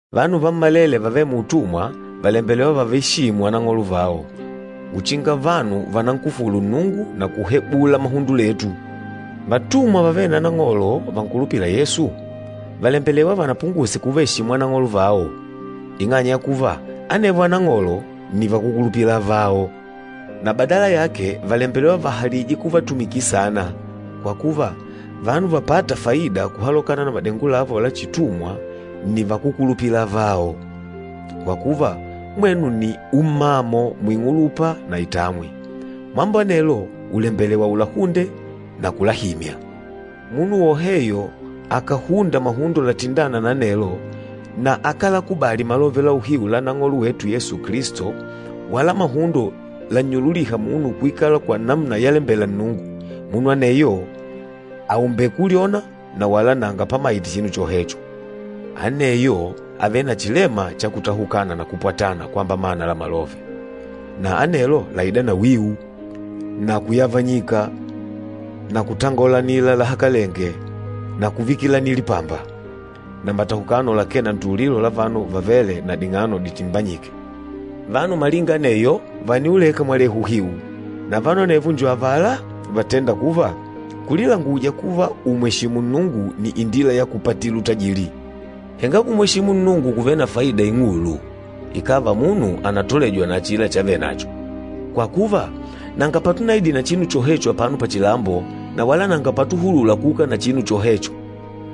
Vanu vammalele vavêle muutumwa vàlembelewa vavaeshimu anang'olo vao, uchinga vanu vanankufulu Nnungu na kuhebula mahundo letu. Vatumwa vavêle na anang'olo vankulupîla Yesu, vàlembelewa vanapunguse kuvaeshimu anang'olo vao, ing'anya ya kuva anevo anang'olo nni vakúkulupila avao. Na badala yake vàlembelewa vahalije kuvatumikila saana, kwa kuva, vanu vapâta faida kuhalokana na madengo lavo la chitumwa nni vakúkulupila avao, kwa kuva, mwenu nni ummamo muing'ulupa na itamwi. Mambo anelo ùlembelewa ulahunde na kulahimya. Munu woheyo akàhunda mahundo latindâna na anelo, na akálakubali malove la uhiu la Nang'olo wetu Yesu Kilisto wala mahundo lannyululîha munu kuikala kwa namuna yalembela Nnungu, munu aneyo àumbele kulyona na wala nanga pamaite chinu chohecho. Aneyo àvele na chilema cha kutahukana na kupwatana kwamba mana la malove. Na anelo làida na wiu, na kuyavanyika na kutangolanila lahakalenge na kuvikilanila lipamba, na matahukano lakee na ntululilo la vanu vavêle na ding'ano ditimbanyike. Vanu malinga aneyo, vàniuleka mwalehu uhiu. Na vanu anevo njo avala vatênda kuva, kulilanguja kuva ùmweshimu Nnungu nni indila ya kupatila utajili. Henga kumweshimu Nnungu kùvele na faida ing'ulu, ikàva munu ànatolejwa na achila chavenacho. Kwa kuva, nanga patunaidile na chinu chohecho apano pachilambo, na wala nanga patuhulula kuuka na chinu chohecho.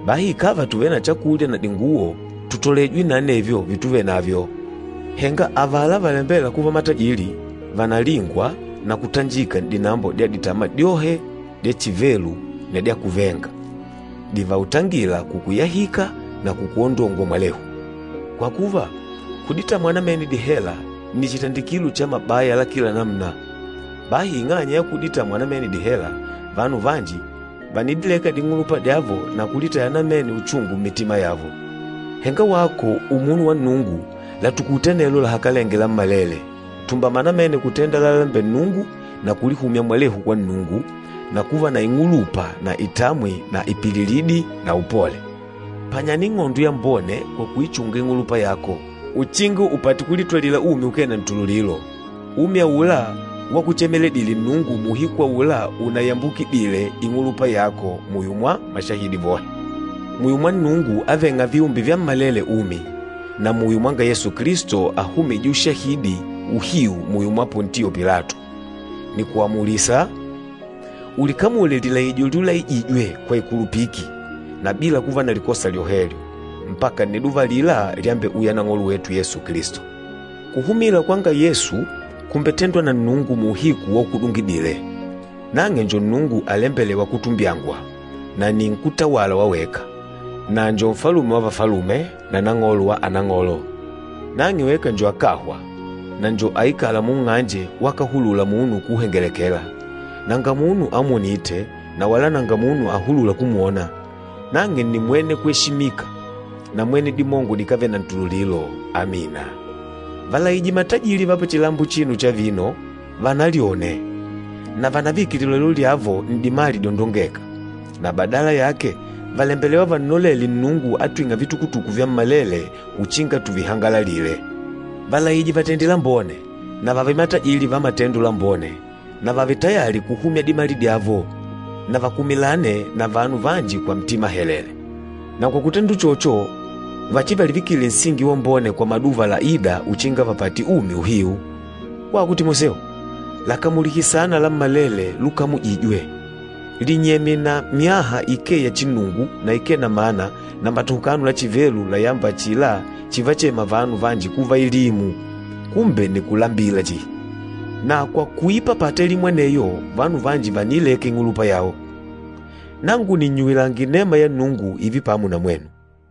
Bahi ikàva tùvele na chakulya na dinguwo, tutolejwe na anevyo vituvenavyo. Henga avala valembêla kuva matajili, vànalingwa na kutanjika n'dinambo dya ditama dyohe dya chivelu na dya kuvenga, divautangîla kukuyahika na kukuondongwa mwalehu. Kwa kuva, kuditamwa namene dihela nni chitandikilo cha mabaya la kila namuna. Bahi ing'anya ya kuditamwa namene dihela, vanu vanji vànidileka ding'ulupa dyavo na kulitaya namene uchungu mmitima yavo. Henga wako umunu wa Nnungu, latukute anelo lahakalenge lammalele. Tumbama namene kutenda lalalembela Nnungu na kulihumya mwalehu kwa Nnungu, na kuva na ing'ulupa na itamwi na ipililidi na upole. Panyana ing'ondo yambone kwa kuichunga ing'ulupa yako, uchinga upate kulitwalila umi ukee na ntululilo, umi aula wakuchemeledile Nnungu muuhiku aula unaiyambukidile ing'ulupa yako muyo mwa mashahidi vohe. Muyo mwa Nnungu avêng'a viumbe vyammalele umi, na muyo mwanga Yesu Kilisto ahumîje ushahidi uhiu muyo mwa Pontio Pilato, nìkuamulisa, ulikamule lilaijo lyulaijijwe kwa ikulupiki, na bila kuva na likosa lyohelyo, mpaka nniduva alila lyambeuya Nang'olo wetu Yesu Kilisto. Kuhumila kwanga Yesu kùmbetendwa na Nnungu muuhiku waukudungidile. Nang'e njo Nnungu alembelêwa kutumbyangwa, na nni nkútawala wa weka, na njo Nfalume wa vafalume, na Nang'olo wa anang'olo. Nang'e weka njo akáhwa, na njo aikâla munng'anje wakahulula munu kuuhengelekela. Nanga munu amwonîte, na wala nanga munu ahulûla kumwona. Nang'e nni mwene kweshimika na mwene dimongo dikávele na ntululilo! Amina. Valaije matajili va pachilambo achino cha vino, vanalyone, na vanavike lilolelo lyavo n'dimali dyondongêka. Na badala yake vàlembelewa vannolele Nnungu atwîng'a vitukutuku vyammalele uchinga tuvihangalalile. Valaije vatende lambone, na vààve matajili va matendo lambone, na vààve tayali kuhumya dimali dyavo, na vakumilane na vanu vanji kwa ntima helele. Na kwa kutenda uchocho, vachivalivikile nsingi wambone kwa maduva laîda uchinga vapate umi uhiu. Wako Timoseo, lakamulihe saana lammalele lukamujijwe. Linyemye na myaha ikee ya chinnungu na ikee na mana na matahukano la chivelu layâmba achila chivachema vanu vanji kuva elimu, kumbe nni kulambila chihi. Na kwa kuipapata elimu aneyo vanu vanji vàniileka ing'ulupa yao. Nangu nìnnyuwilanga inema ya Nnungu ììve pamo na mwenu.